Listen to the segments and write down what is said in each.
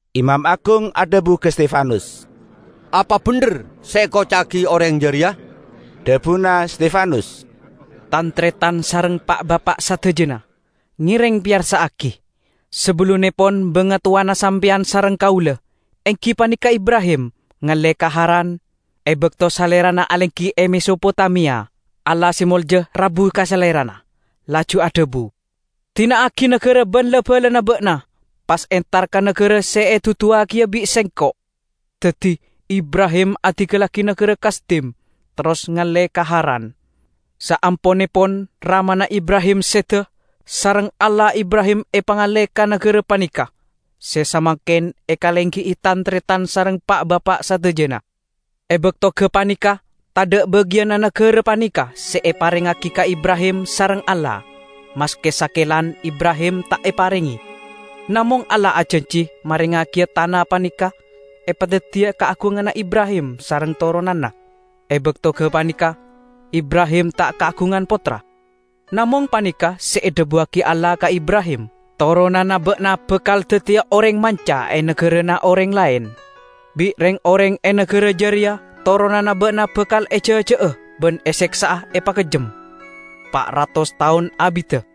Imam agung adhabu ka Stefanus, "Apa bendher se ekoca'agi oreng jareya?" Dhabuna Stefanus, "Tan-taretan sareng Pa'-bapa' sadajana! Ngereng peyarsa'agi! Sabellunnepon bangatowana sampeyan sareng kaula, enggi paneka Ibrahim, ngalle ka Haran, e bakto salerana alenggi e Mesopotamia, Allah se molja rabu ka salerana laju adhabu, 'Dina'agi nagara ban la-balana ba'na, pas entar ka nagara se eduduwagiya bi' Sengko'.' Daddi Ibrahim adinggallagi nagara Kasdim, terros ngalle ka Haran. Saamponnepon ramana Ibrahim seda, sareng Allah Ibrahim epangalle ka nagara paneka, se samangken ekalenggi'i tan-taretan sareng Pa'-bapa' sadajana. E bakto gapaneka tadha' bagiyanna nagara paneka se eparengngagi ka Ibrahim sareng Allah; maske sakelan Ibrahim ta' eparenge. Namong Allah ajanji marengngagiya tana paneka, epadaddiya kaagunganna Ibrahim sareng toronanna. E bakto gapaneka Ibrahim ta' kaagungan pottra. Namong paneka' se edhabuwagi Allah ka Ibrahim, 'Toronanna ba'na bakal daddiya oreng manca e nagarana oreng laen. Bi' reng-oreng e nagara jareya toronanna ba'na bakal ejaja'a ban eseksa'a epakejjem, pa' ratos taon abidda.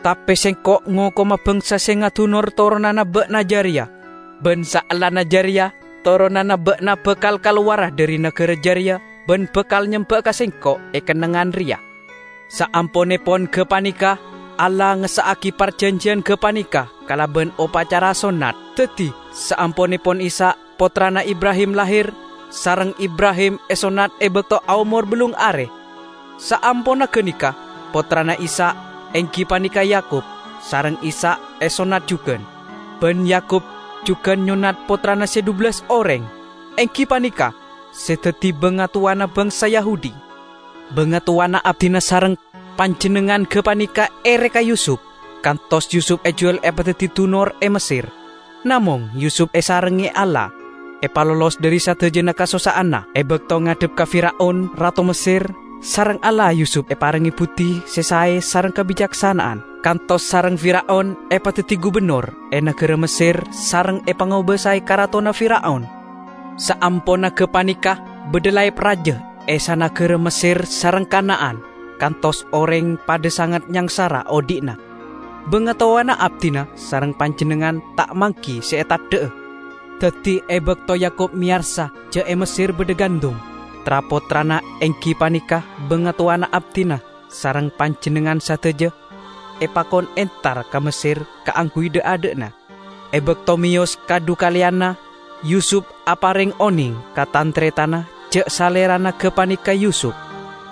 Tape Sengko' ngokoma bangsa se ngadunor toronanna ba'na jareya, ban saellana jareya toronanna ba'na bakal kalowara dhari nagara jareya ban bakal nyemba'a ka Sengko' e kennengngan reya.' Saamponnepon gapaneka, Allah ngessa'agi parjanjiyan gapaneka kalaban opacara sonnat. Daddi saamponnepon Ishak, pottrana Ibrahim, lahir, sareng Ibrahim esonnat e bakto aomor ballung are. Saamponna ganeka, pottrana Ishak, enggi paneka Yakub, sareng Ishak esonnat jugan. Ban Yakub jugan nyonnat pottrana se dhubellas oreng, enggi paneka se daddi bangatowana bangsa Yahudi. Bangatowana abdina sareng panjennengngan gapaneka ere ka Yusup, kantos Yusup ejuwal epadaddi dunor e Messer. Namong Yusup esarengnge Allah, epalolos dhari sadajana kasossa'anna. E bakto ngadhep ka Fir'aun rato Messer, sareng Allah Yusup eparenge buddi se sae sareng kabicaksana'an, kantos sareng Fir'aun epadaddi gubennor e nagara Messer sareng epangobasae karatonna Fir'aun. Saamponna gapaneka badha laep raja e sanagara Messer sareng Kana'an, kantos oreng padha sanget nyangsara odhi'na. Bangatowana abdina sareng panjennengngan ta' manggi se eteddha'a. Daddi e bakto Yakub meyarsa ja' e Messer badha gandum, tra-pottrana, enggi paneka bangatowana abdina sareng panjennengngan sadaja, epakon entar ka Messer kaangguy dha'-adha'na. E bakto meyos kadhukaleyanna, Yusup apareng oneng ka tan-taretanna ja' salerana gapaneka Yusup.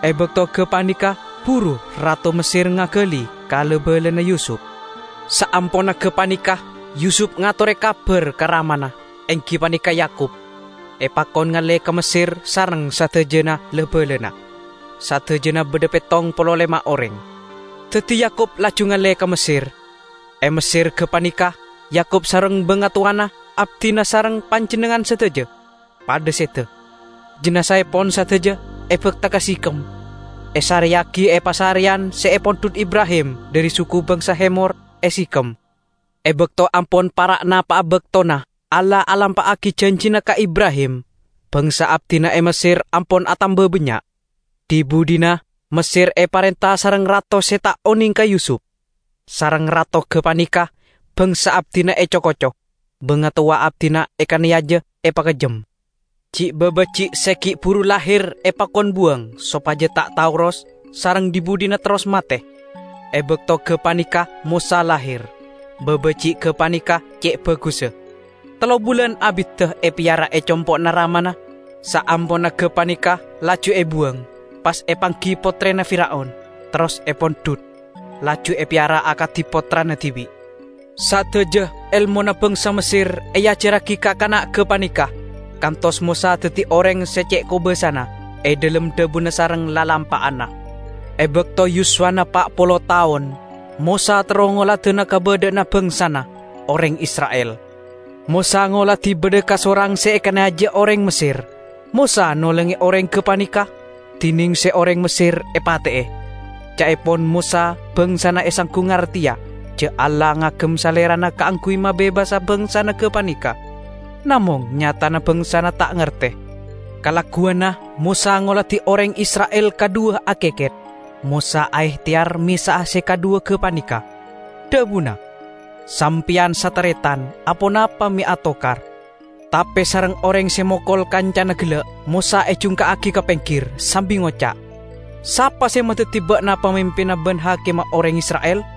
E bakto gapaneka buru rato Messer ngagali ka la-balana Yusup. Saamponna gapaneka Yusup ngatore kabar ka ramana, enggi paneka Yakub, epakon ngalle ka Messer sareng sadajana la-balana -- sadajana badha pettong polo lema' oreng. Daddi Yakub laju ngalle ka Messer; e Messer gapaneka Yakub sareng bangatowana abdina sareng panjennengngan sadaja, padha seda. Jinazaepon sadaja ebakta ka Sikhem, esareyagi e pasareyan se epondhut Ibrahim dhari suku bangsa Hemor e Sikhem. E bakto ampon para' napa'a baktona Allah alampa'agi janjina ka Ibrahim, bangsa abdina e Messer ampon atamba bannya'. Dhi-budhina Messer eparenta sareng rato se ta' oneng ka Yusup. Sareng rato gapaneka bangsa abdina eco-koco, bangatowa abdina ekaneyaja epakejjem. Ji'-babaji' se gi' buru lahir epakon buwang sopaja ta' taoros sareng dhi-budhina terros mate. E bakto gapaneka Mosa lahir; babaji' gapaneka ce' bagussa. Tello bulan abidda epeyara e compo'na ramana, saamponna gapaneka laju ebuwang, pas epanggi pottrena Fir'aun, terros epondhut, laju epeyara akadi pottrana dibi'. Sadaja elmona bangsa Messer eajarragi ka kana' gapaneka, kantos Mosa daddi oreng se ce' kobasana e dhalem dhabuna sareng lalampa'anna. E bakto yuswana pa' polo taon, Mosa terro ngoladana kabadha'anna bangsana, oreng Isra'il. Mosa ngoladi badha kasorang se ekaneyaja oreng Messer; Mosa nolonge oreng gapaneka, dineng se oreng Messer epate'e. Ca'epon Mosa bangsana esanggu ngarteya ja' Allah ngagem salerana kaangguy mabebasa bangsana gapaneka. Namong nyatana bangsana ta' ngarte. Kalagguwanna Mosa ngoladi oreng Isra'il kadhuwa akeket, Mosa aehteyar mesa'a se kadhuwa gapaneka. Dhabuna, 'Sampeyan sataretan, aponapa me' atokar?' Tape sareng oreng se mokol kancana gella', Mosa ejungka'agi ka penggir, sambi ngoca', 'Sapa se madaddi ba'na pamimpinna ban hakimma oreng Isra'il?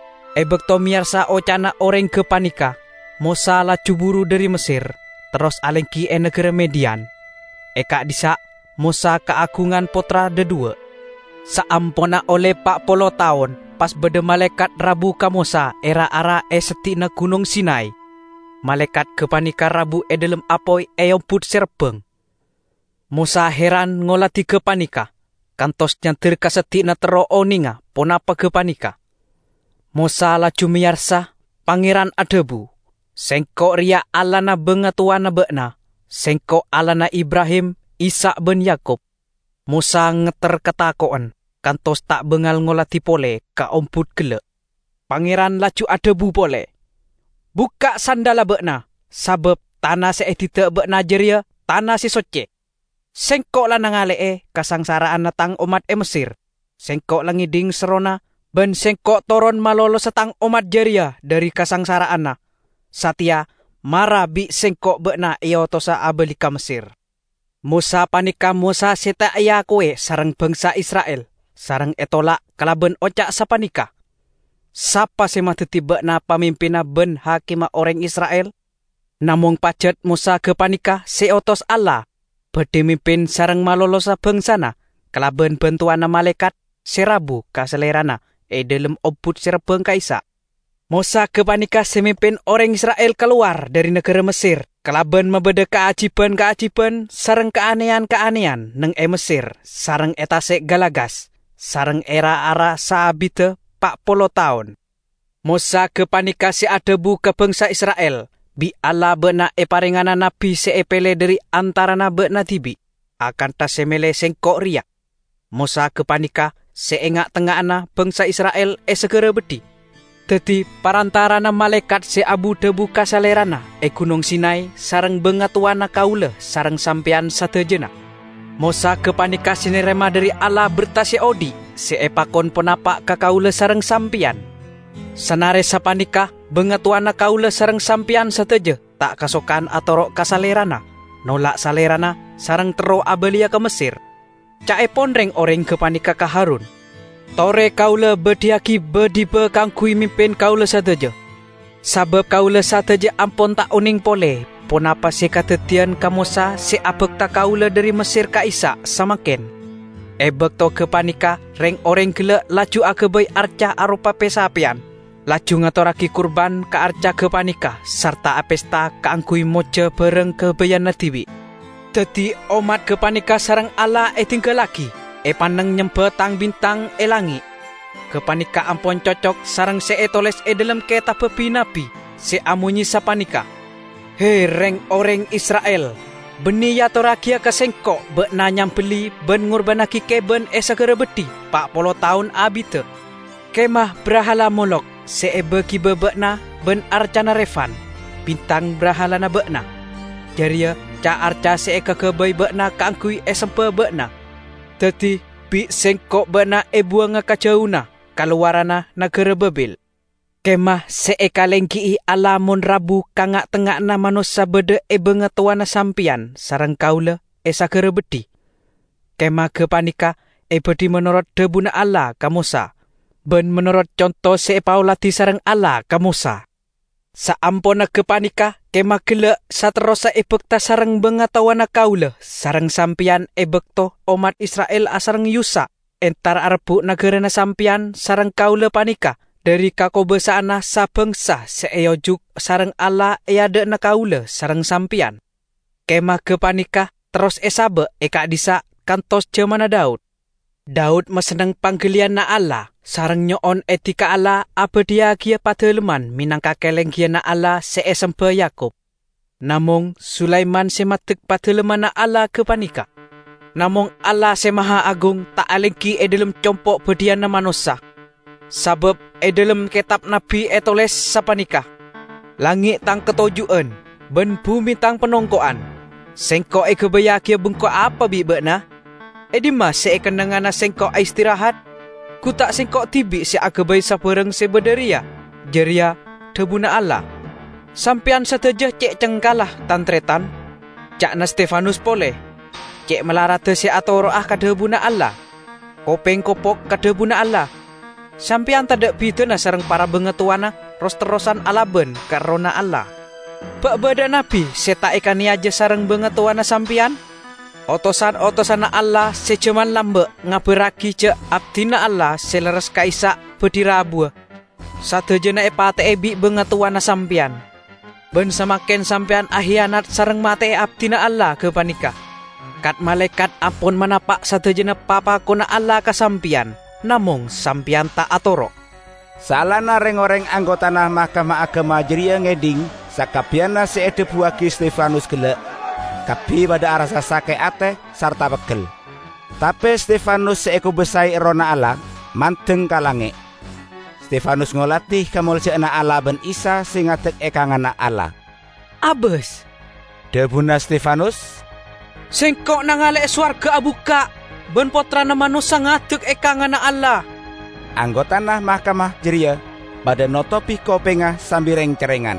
E bakto meyarsa oca'na oreng gapaneka, Mosa laju buru dhari Messer, terros alenggi e nagara Midian. E ka'dhissa' Mosa kaagungan pottra dhadhuwa'. Saamponna olle pa' polo taon pas badha malaekat rabu ka Mosa e ra-ara e seddi'na Gunong Sinay. Malaekat gapaneka rabu e dhalem apoy e ombut se rabbang. Mosa heran ngoladi gapaneka, kantos nyander ka seddi'na terro onenga ponapa gapaneka. Mosa laju meyarsa Pangeran adhabu, 'Sengko' reya Allahna bangatowana ba'na; Sengko' Allahna Ibrahim, Ishak ban Yakub.' Mosa ngetter katako'en kantos ta' bangal ngoladi pole ka ombut gella'. Pangeran laju adhabu pole, 'Bukka' sandhalla ba'na, sabab tana se edidda' ba'na jareya tana se socce. Sengko' la nangale'e kasangsara'anna Tang ommat e Messer. Sengko' la ngedhing serrona, ban Sengko' toron malolosa Tang ommat jareya dhari kasangsara'anna. Sateya, mara! Bi' Sengko' ba'na eotosa abali ka Messer.' Mosa paneka Mosa se ta' eakowe sareng bangsa Isra'il sareng etolak kalaban oca' sapaneka, 'Sapa se madaddi ba'na pamimpinna ban hakimma oreng Isra'il?' Namong pajat Mosa gapaneka se eotos Allah badhi mimpin sareng malolosa bangsana kalaban bantowanna malaekat se rabu ka salerana e dhalem ombut se rabbang ka'issa'. Mosa gapaneka se mimpin oreng Isra'il kalowar dhari nagara Messer kalaban mabadha kaajiban-kaajiban sareng kaaneyan-kaaneyan neng e Messer sareng e Tase' Galagas, sareng e ra-ara saabidda pa' polo taon. Mosa gapaneka se adhabu ka bangsa Isra'il, 'Bi' Allah ba'na eparengngana nabbi se epele dhari antarana ba'na dibi', akantha se mele sengko' reya.' Mosa gapaneka se e nga'-tengnga'anna bangsa Isra'il e sagara beddhi, daddi parantarana malaekat se abu-dhabu ka salerana e Gunong Sinay sareng bangatowana kaula sareng sampeyan sadajana. Mosa gapaneka se narema dhari Allah berta se odhi' se epakon panapa' ka kaula sareng sampeyan. Sanare sapaneka, bangatowana kaula sareng sampeyan sadaja ta' kasokan atoro' ka salerana, nolak salerana, sareng terro abaliya ka Messer. Ca'epon reng-oreng gapaneka ka Harun, 'Tore kaula badhiyagi ba-diba kaangguy mimpin kaula sadaja. Sabab kaula sadaja ampon ta' oneng pole ponapa se kadaddiyan ka Mosa se abakta kaula dhari Messer ka'issa' samangken!' E bakto gapaneka reng-oreng gella' laju agabay arca aropa pe-sapeyan, laju ngatorragi kurban ka arca gapaneka sarta apesta kaangguy mojja barang gabayanna dibi'. Daddi ommat gapaneka sareng Allah edinggallagi, epanneng nyemba tang-bintang e langnge'. Gapaneka ampon cocok sareng se etoles e dhalem ketabba bi-nabbi, se amonye sapaneka, 'He, reng-oreng Isra'il! Banne eatorragiya ka Sengko' ba'na nyambelli ban ngurbannagi keban e sagara beddhi pa' polo taon abidda. Kemah brahala Molokh se eba-giba ba'na ban arcana Refan, bintang brahalana ba'na; jareya ca-arca se ekagabay ba'na kaangguy esemba ba'na. Daddi bi' Sengko' ba'na ebuwanga ka jauna ka lowaranna nagara Babil.' Kemah se ekalenggi'i Allah mon rabu ka nga'-tengnga'anna manossa badha e bangatowana sampeyan sareng kaula e sagara beddhi. Kemah gapaneka ebadhi menorot dhabuna Allah ka Mosa, ban menorot conto se epaoladi sareng Allah ka Mosa. Saamponna gapaneka kemah gella' saterrossa ebakta sareng bangatowana kaula sareng sampeyan e bakto ommat Isra'il asareng Yusak entar arebbu' nagarana sampeyan sareng kaula paneka dhari kakobasa'anna sa-bangsa se eojuk sareng Allah e adha'na kaula sareng sampeyan. Kemah gapaneka terros esaba' e ka'dhissa' kantos jamanna Daud. Daud masenneng panggaliyanna Allah, sareng nyo'on edi ka Allah abadhiyagiya padalemman menangka kalenggiyanna Allah se esemba Yakub. Namong Sulaiman se maddek Padalemmanna Allah gapaneka. Namong Allah Se Mahaagung ta' alenggi e dhalem compo' badhiyanna manossa; sabab e dhalem ketab nabbi etoles sapaneka, 'Langnge' Tang katoju'an, ban bume Tang panongko'an. Sengko' egabayyagiya bengko apa bi' ba'na? E dhimma se ekennengngana Sengko' aistirahat? Gu ta' Sengko' dibi' se agabay sabarang se badha reya?' jareya dhabuna Allah. Sampeyan sadaja ce' cengkalla, tan-taretan! ca'na Stefanus pole. Ce' malaradda se atoro'a ka dhabuna Allah! Kopeng kopok ka dhabuna Allah! Sampeyan tadha' bidana sareng para bangatowana; ros-terrosan alaban ka Errohna Allah! Ba' badha'a nabbi se ta' ekaneyaja sareng bangatowana sampeyan? Otosan-otosanna Allah se jaman lamba' ngabarragi ja' Abdina Allah se lerres ka'issa' badhi rabuwa, sadajana epate'e bi' bangatowana sampeyan. Ban samangken sampeyan akiyanat sareng mate'e Abdina Allah gapaneka. Kat-malaekat ampon manapa' sadajana papakonna Allah ka sampeyan, namong sampeyan ta' atoro'!" Saellana reng-oreng anggotana Mahkamah Agama jareya ngedhing sakabbiyanna se edhabuwagi Stefanus gella', kabbi padha arassa sake' ate sarta peggel. Tape Stefanus se ekobasae Errohna Allah, mandeng ka langnge'. Stefanus ngoladi kamolja'anna Allah ban Isa se ngadek e kanganna Allah. "Abas!" dhabuna Stefanus, "sengko' nangale'e sowarga abukka' ban Pottrana Manossa ngadek e kanganna Allah!" Anggotana mahkamah jareya padha notobi kopengnga sambi reng-cerrengan,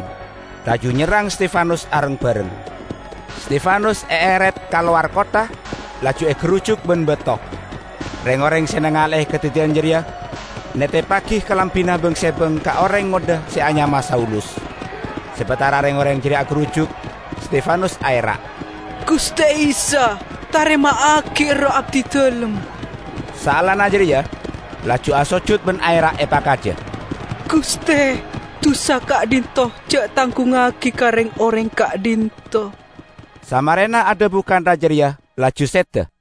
laju nyerrang Stefanus areng-bareng. Stefanus eeret ka lowar kottha, laju egarujuk ban bato. Reng-oreng se nangale'e kadaddiyan jareya neteppagi kalambina bang-sebang ka oreng ngodha se anyama Saulus. Sabatara reng-oreng jareya agarujuk, Stefanus aera', "Guste Isa, tarema'agi erroh abdidalem!" Saellana jareya laju asojut ban aera' epakaja, "Guste, dusa ka'dhinto' ja' tanggungngagi ka reng-oreng ka'dhinto'!" Samarena adhabu kantha jareya laju seda.